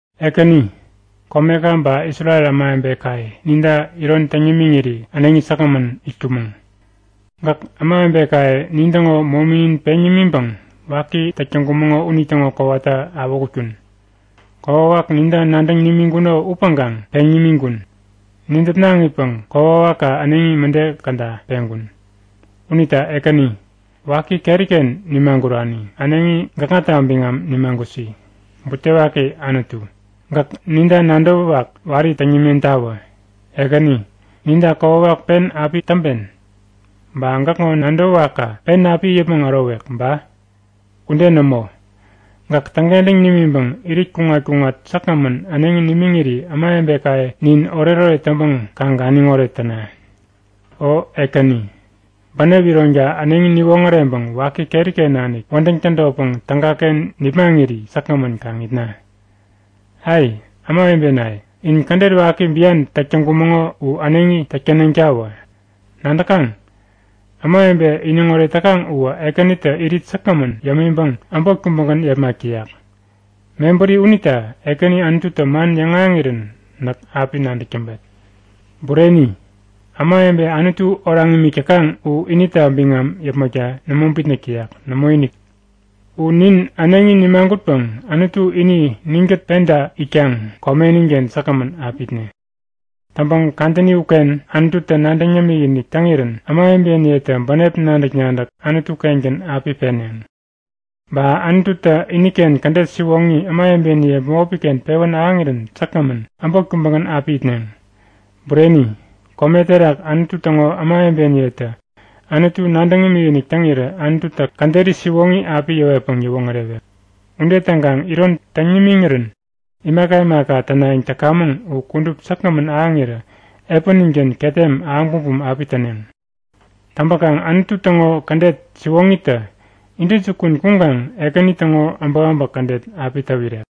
Ekäni, komeka ba Isrel ämawebekaye ninta iron täŋ nimiŋiri äneŋi säkgämän itkumäŋ. Gäk ämawebekaye nintäŋo mominin peŋ nimiŋpäŋ waki täk täŋkumäŋo unitäŋo kowata awähutkun. Kokwawak ninta nadäŋ nimiŋkuno upäŋkaŋ peŋ nimiŋkun. Nidäpnaŋipäŋ kokwawakka äneŋi mäde käda peŋkun. Unita Ekäni, waki keriken nimagurani, äneŋi gäkŋata biŋam nimagusi. Butewaki Anutu, gäk ninta nadäwäwak wari täŋ nimentawä. Ekäni, ninta kokwawak pen api täŋpen? Ba gäkŋo nadäwäwakka pen api it yäpmäŋ ärowek ba? Ude nämo! Gäk täŋkentäŋ nimiŋpäŋ irit kuŋat-kuŋat säkgämän äneŋi nimiŋiri ämawebekaye nin oretoret täŋpäŋ kaŋ ganiŋoret täna. O Ekäni, bänep ironka äneŋi niwoŋäreŋpäŋ waki keriken nanik wädäŋ tädotpäŋ tägaken nipmaŋiri säkgämän kaŋ itna. Ai, ämawebenaye, nin kädet waki bian täk täŋkumäŋo u äneŋi täk tänetawä. Nadäkaŋ? Ämawebe iniŋoret täkaŋ uwä Ekänitä irit säkgämän yämiŋpäŋ äbot kubägän yepmak täyak. Mebäri unita Ekäni Anututä man yäŋahäŋirän näk api nadäk täŋpet. Bureni! Ämawebe Anutu oraŋ imik täkaŋ u inita biŋam yäpmäkta nämo bitnäk täyak. Nämoinik. U nin äneŋi nimagutpäŋ Anutu ini ninkät penta itkaŋ komeninken säkgämän api itne. Täŋpäŋ kadäni uken Anututä nadäŋ yämik-inik täŋirän ämawebeniyetä bänep nadäk-nadäk Anutu-kengän api peneŋ. Ba Anututä iniken kädet siwoŋi ämawebeniye bämopiken pewän ahäŋirän säkgämän, äbot kubägän api itneŋ. Bureni! Kome terak Anutu täŋo ämawebeniyetä Anutu nadäŋ imikinik täŋirä Anututä käderi siwoŋi api yäwetpäŋ yäwoŋärewek. Ude täŋkaŋ iron täŋ nimiŋirän imaka imaka tänayäŋ täkamäŋ u kudup säkgämän ahäŋirä epäninken ketem ahäŋ bumbum api täneŋ. Täŋpäkaŋ Anutu täŋo kädet siwoŋitä intäjukun kuŋkaŋ Ekäni täŋo äbäkäbäk kädet api täwirek.